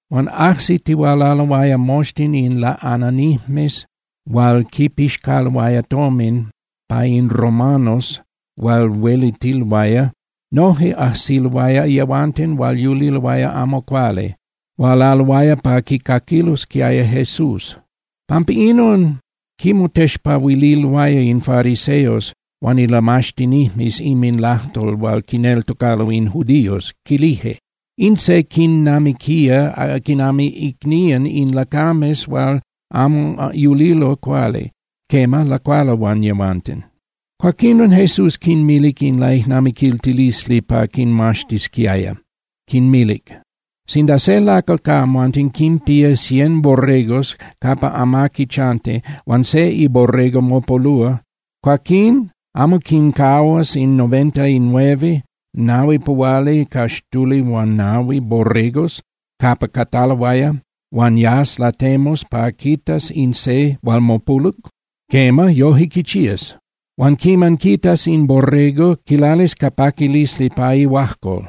Huan ajsitihualaloaya moxtin in laꞌananijmes hual quipixcaloaya tomin pa in romanos hual huelitiloaya. Noje ajsiloaya yehuanten hual yuliloaya amo cuali, hualaloaya pa quicaquilosquiaya Jesús. Pampa inon quimotexpahuililoaya in fariseos huan ilamaxtinijmes inminlajtol hual quineltocalo in judíos, quilije: —In se quinnamiquía quinami icnían in lacames hual amo yulilo cuali, quema, lacualo huan yehuanten. Cuaquinon Jesús quinmilic in laijnamiquiltilisli pa quinmaxtisquiaya, quinmilic: —Sinda se lacal ca amhuanten quinpía cien borregos capa amaqui chanti, huan se iborrego mopolúa, cuaquín ¿amo quincahuas in noventa y nueve (nahuipuhualicaxtulihuanahui) borregos capa cataloaya huan yas latemus pa quitas in se hual mopoluc? Quema, yoje quichías. Huan quiman quitas in borrego, quilalis ca paquilisli pa ihuajcol.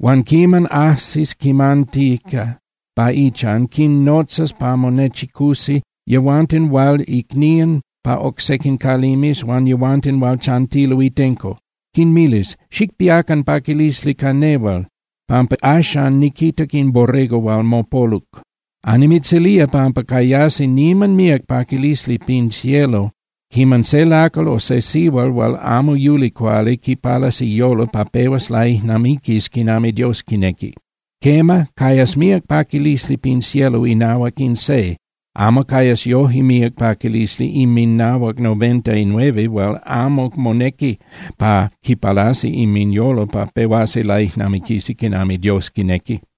Huan quiman ajsis quimantica pa ichan, quinnotzas pa monechicusi yehuanten hual icnían pa oc sequin calimes huan yehuanten hual chantilo itenco, quinmilis: “Xicpiacan paquilisli ca nehual, pampa axan niquitac in borrego hual mopoluc.” Annimitzilía pampa cayasi niman míac paquilisli pin cielo quiman se lacal o se sihual hual amo yuli cuali quipalas iyolo pa pehuas laijnamiquis quinami Dios quinequi. Quema, cayas míac paquilisli pin cielo inahuac in se, amo cayas yoje míac paquilisli inminahuac noventainueve hual amo monequi pa quipalasi inminyolo pa pehuasi laijnamiquisi quinami Dios quinequi.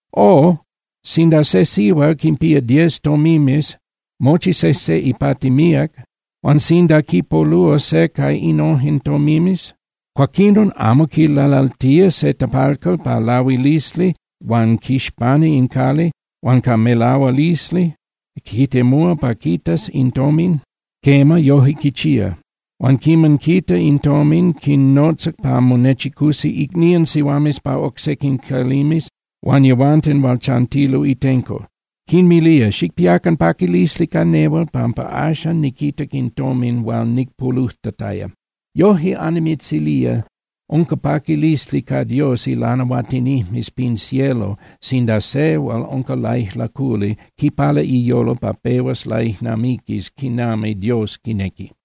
’O, sinda se sihual quinpía diez tomimes, mochi sejse ipati míac, huan sinda quipolúa se ca innojen tomimes, cuaquinon ¿amo quilalaltía se tapalcal pa lahuilisli huan quixpana in cali, huan ca melahualisli quitemúa pa quitas in tomin? Quema, yoje quichía. Huan quiman quita in tomin, quinnotza pa monechicusi icnían sihuames pa oc sequin calimes huan yehuanten hual chantilo itenco, quinmilía: “Xicpiacan paquilisli ca nehual, pampa axan niquitac in tomin hual nicpolujtataya.” Yoje annimitzilía, unca paquilisli ca Dios ilanahuatinijmes pin cielo sinda se hual unca laijlaculi quipala iyolo pa pehuas laijnamiquis quinami Dios quinequi.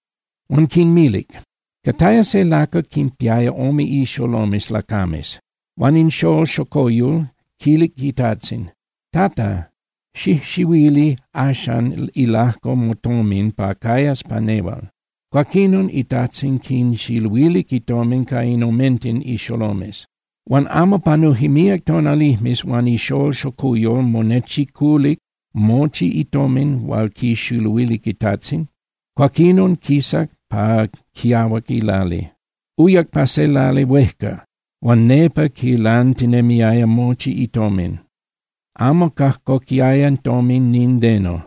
Huan quinmilic: —Cataya se lacal quinpiaya ome ixolomes lacames. Huan in xól xocuyol quilic itajtzin: “Tata, xijxiluili axan ilajco motomin hual cayas pa nehual.” Cuaquinon itajtzin quinxiluilic itomin ca in omenten ixolomes. Huan amo panuje míac tonalijmes, huan ixól xocuyol monechiculic mochi itomin hual quixiluilic itajtzin, cuaquinon quisac pa quiahuac ilali. Uyac pa se lali huejca, huan nepa quilantinemiaya mochi itomin. Amo cajcoquiaya tomin nindeno,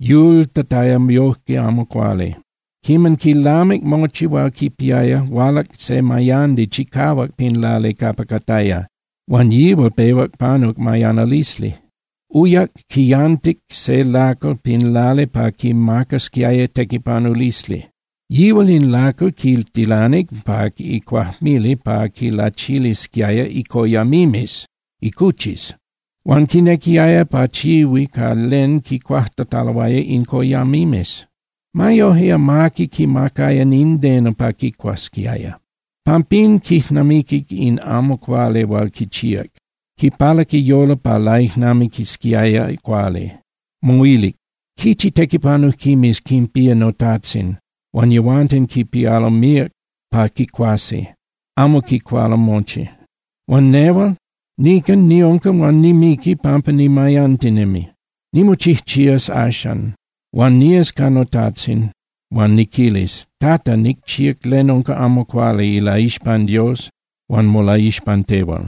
yultataya yoje amo cuali. Quiman quilamic mochi hual quipiaya, hualac se mayandi chicahuac pin lali capa cataya, huan yihual pehuac panuc mayanalisli. Uyac, quiyantic se lacal pin lali pa quimacasquiaya tequipanulisli. Yihual in lacal quitilanic pa icuajmili pa quilachilisquiaya icoyamimes (icuchis). Huan quinequiaya pachihui ca len quicuajtataloaya in coyamimes. Ma yoje, amaqui quimacaya nindeno pa quicuasquiaya. Pampín, quijnamiquic in amo cuali hual quichíac, quipalac iyolo pa laijnamiquisquiaya cuali, moilic: “Quichi tequipanujquimes quinpía notajtzin huan yehuanten quipialo míac pa quicuasi, amo quicualo mochi. Huan nehual nican niunca huan nimiqui pampa nimayantinemi. Nimochijchías axan huan nías ca notajtzin huan niquilis: Tata, nicchíac len unca amo cuali ilaixpan Dios huan molaixpan tehual.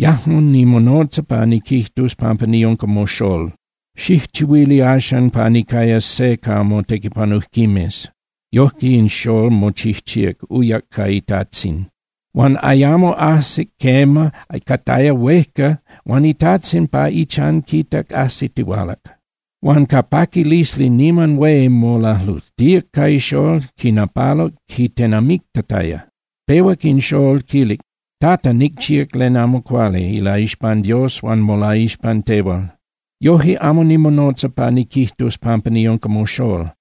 Yajmo nimonotza pa niquijtus pampa niunca moxól. Xijchihuili axan pa nicayas se ca motequipanujquimes.” Yoje in xól mochijchíac, uyac ca itajtzin. ’Huan ayamo ajsic, quema, cataya huejca huan itajtzin pa ichan quitac ajsitihualac. Huan ca paquilisli niman hué molalujtíac ca ixól, quinapaluc quitenamictataya. Pehuac in xól quilic: “Tata, nicchíac len amo cuali ilaixpan Dios huan molaixpan tehual. Yoje amo nimonotza pa niquijtus pampa niunca moxól.”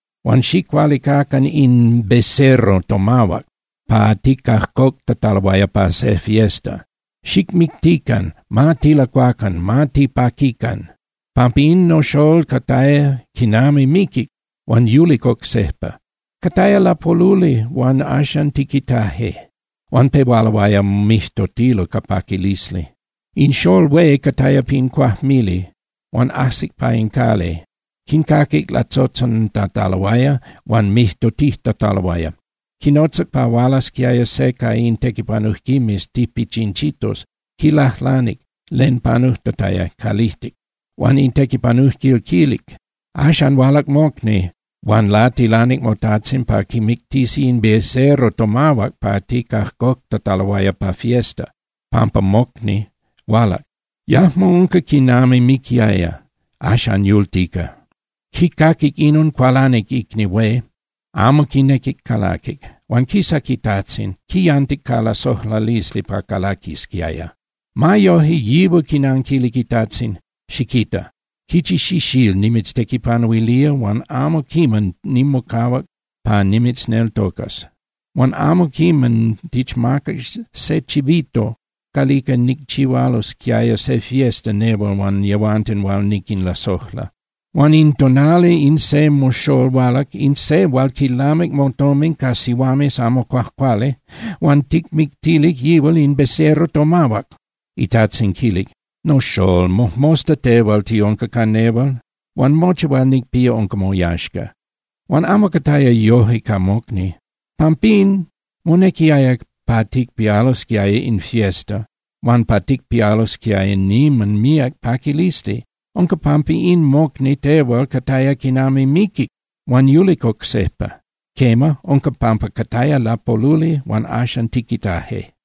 Huan xicualicacan in becerro tomahuac hual ticajcoctataloaya pa se fiesta. ¡Xicmictican, ma tilacuacan, ma tipaquican! Pampa in noxól cataya quinami miquic huan yulic oc sejpa, cataya lapoluli huan axan tiquitaje.” Huan pehualoaya mijtotilo ca paquilisli. ’In xól hué cataya pin cuajmili. Huan ajsic pa in cali, quincaquic latzotzontataloaya huan mijtotijtataloaya. Quinotzac pa hualasquiaya se ca in tequipanujquimes tipichinchitos, quilajlanic len panujtataya calijtic. Huan in tequipanujquil quilic: “Axan hualac mocni huan latilanic motajtzin pa quimictisi in becerro tomahuac hual ticajcoctataloaya pa fiesta, pampa mocni hualac. Yajmo unca quinami miquiaya, axan yultica.” Quicaquic inon, cualanic icni hué, amo quinequic calaquic. Huan quisac itajtzin, quiyantic ca lasojlalisli pa calaquisquiaya. Ma yoje, yihual quinanquilic itajtzin: “Xiquita. Quichi xixíl nimitztequipanuilía huan amo quiman nimocahuac pa nimitzneltocas. Huan amo quiman tichmacac se chivito calica ticchihualosquiaya se fiesta nehual huan yehuanten hual niquinlasojla. Huan in tonali in se moxól hualac, in se hual quilamic motomin ca sihuames amo cuajcuali. Huan ¡ticmictilic yihual in becerro tomahuac!” Itajtzin quilic: “Noxól, mojmosta tehual tiunca ca nehual huan mochi hual nicpía unca moyaxca. Huan amo cataya yoje ca mocni. Pampín, monequiaya pa ticpialosquiaya in fiesta huan pa ticpialosquiaya niman míac paquilisli. Unca pampa in mocni tehual cataya quinami miquic huan yulic oc sejpa. Quema, unca pampa cataya lapoluli huan axan tiquitaje.”